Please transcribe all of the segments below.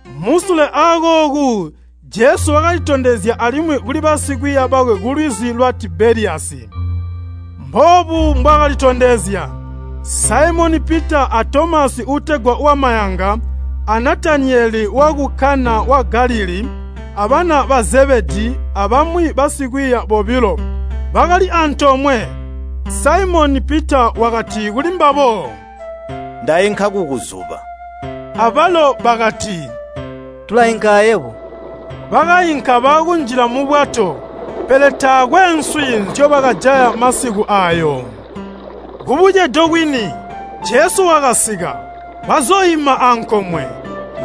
Musule akooku Jesu wakalitondezya alimwi kuli basikwiiya bakwe kulwizi lwa Tibeliyasi. Mboobu mbwaakalitondezya. Saimoni Pita a Tomasi uutegwa wamayanga, a Natanayeli waku Kana wa Galilii, abana ba Zebedii abamwi basikwiiya bobilo, bakali antoomwe. Saimoni Pita wakati kulimbabo “Ndainka kukuzuba.” Abalo bakati, “Tulainka ayebo.” Bakainka baakunjla mubwato. Pele taakwe nswi nzyobakajaya masiku aayo. Kubucedo kwini, Jesu wakasika, wazooima ankomwe.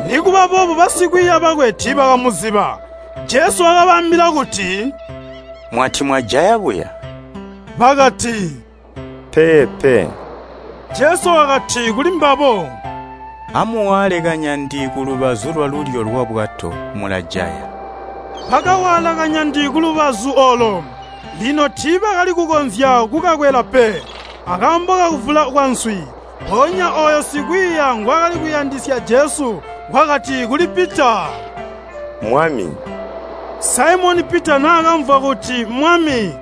Nikuba boobo basikwiiya bakwe tiibakamuziba. Jesu wakabaambila kuti, “Mwati mwajaya buya?” Bakati, “Peepe.” Jesu wakati kulimbabo, “Amuwaale kanyandi kulubazu lwalulyo lwabwato, mulajaya.” Bakawaala kanyandi kulubazu oolo. Lino tiibakali kukonzya kukakwela pe, akaambo kakuvula kwanswi. Mpoonya ooyo sikwiiya ngwaakali kuyandisya Jesu wakati kuli Pita. “Mmwami!” Saimoni Pita naakamvwa kuti Mmwami,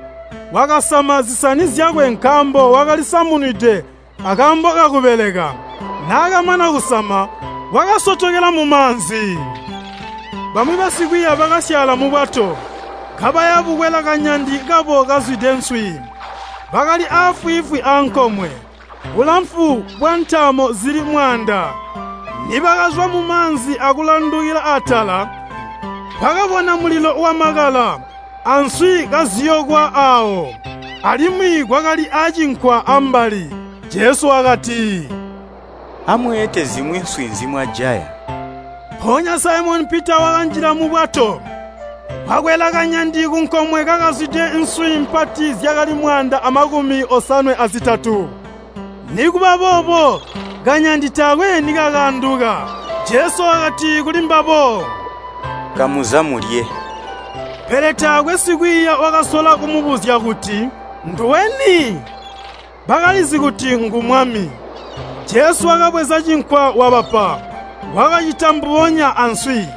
wakasama zisani zyakwe nkaambo wakali samunwide akaambo kakubeleka. Naakamana kusama, wakasotokela mumaanzi. Bamwi basikwiiya bakasyaala mubwato, kabaya bukwela kanyandi kabo kazwide nswi. Bakali aafwiifwi ankomwe, bulamfu bwantaamo zili mwaanda. Nibakazwa mumaanzi akulandukila atala, bakabona mulilo wamakala, answi kaziyokwa aawo, alimwi kwakali acinkwa ambali. Jesu wakati, “Amweete zimwi nswi nzimwajaya.” Mpoonya Saimoni Pita wakanjila mubwato, wakwela kanyandi kunkomwe kakazwide, nswi mpati zyakali mwaanda amakumi osanwe azitatu. Nikuba boobo, kanyandi taakwe nikakaanduka. Jesu wakati kulimbabo, “Kamuza mulye.” Pele taakwe sikwiiya wakasola kumubuzya kuti, “Nduwe ni?” Bakalizi kuti ngu Mwami. Jesu wakabweza cinkwa wabapa. Wakacita mbubonya answi.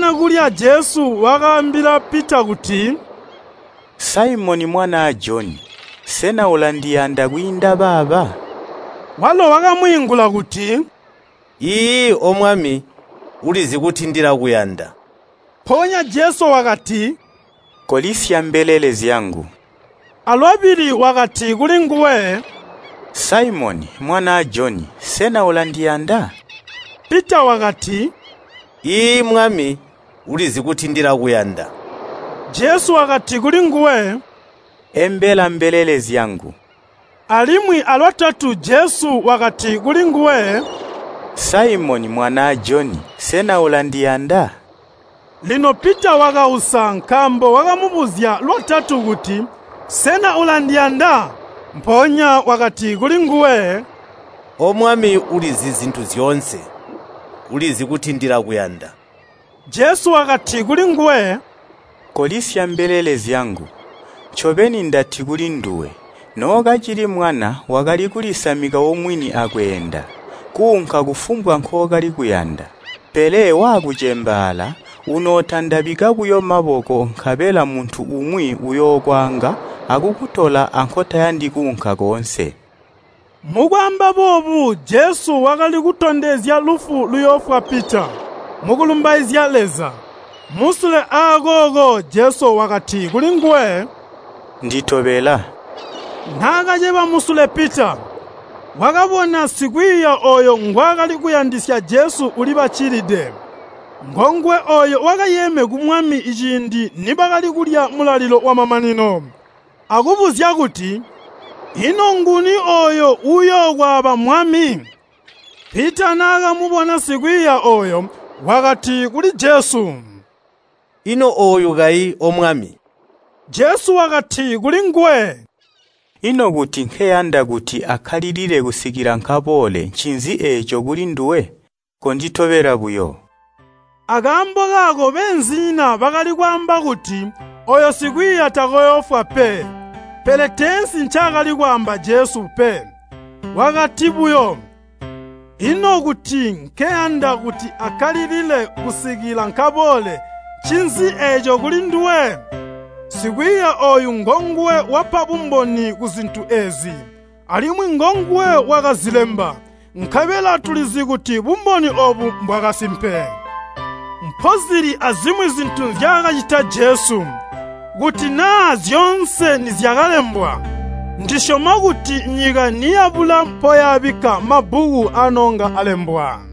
Nibakamana kulya Jesu wakaambila Pita kuti, “Saimoni mwanaa Joni, sena ulandiyanda kwiinda baaba?” Walo wakamwiingula kuti “Iiyi, O Mwami, ulizi kuti ndilakuyanda.” Mpoonya Jesu wakati, “Kolisya mbelele zyangu.” Alwabili wakati kulinguwe, “Saimoni, mwanaa Joni, sena ulandiyanda?” Pita wakati, “Iiyi, Mwami, ulizi kuti ndilakuyanda,” Jesu wakati kulinguwe, “Embela mbelele zyangu.” Alimwi alwatatu Jesu wakati kulinguwe, “Saimoni, mwanaa Joni, sena ulandiyanda?” Lino Pita wakausa nkaambo wakamubuzya lwatatu kuti, “Sena ulandiyanda?” Mpoonya wakati kulinguwe “O Mwami ulizi zintu zyoonse. Ulizi kuti ndilakuyanda.” Jesu wakati kulinguwe, “Kolisya mbelele zyangu. Ncobeni ndati kulinduwe, nookacili mwana wakali kulisamika omwini akweenda, kuunka kufumbwa nkookali kuyanda. Pele waakucembaala, unootandabika buyo maboko nkabela muntu umwi uyookwaanga akukutola ankotayandi kuunka koonse.” Mukwaamba boobu Jesu wakali kutondezya lufu luyoofwa Pita mukulumbaizya Leza. Musule aakooko Jesu wakati kulinguwe, “Nditobela.” Naakaceba musule Pita, wakabona sikwiiya ooyo ngwaakali kuyandisya Jesu ulibaccilide. Ngonguwe ooyo wakayeeme ku Mwami ciindi nibakali kulya mulalilo wamamanino, akubuzya kuti, “Ino nguni ooyo uyookwaaba Mwami?” Pita naakamubona sikwiiya ooyo, wakati kuli Jesu, “Ino ooyu kayi, O Mwami?” Jesu wakati kulinguwe, “Ino kuti nkeyanda kuti akkalilile kusikila nkaboole ncinzi eeco kulinduwe? Konditobela buyo!” Akaambo kaako beenzinyina bakali kwaamba kuti ooyo sikwiiya takooyoofwa pe, pele teensi ncaakali kwaamba Jesu pe. Wakati buyo, “Ino kuti nkeyanda kuti akkalilile kusikila nkaboole, ncinzi eeco kulinduwe?” Sikwiiya ooyu ngonguwe wapa bumboni kuzintu eezi, alimwi ngonguwe wakazilemba, nkabela tulizi kuti bumboni oobu mbwakasimpe. Mpozili azimwi zintu nzyaakacita Jesu. Kuti naa zyoonse nizyakalembwa, ndisyoma kuti nyika niyabula mpoyaabikka mabbuku anoonga alembwa.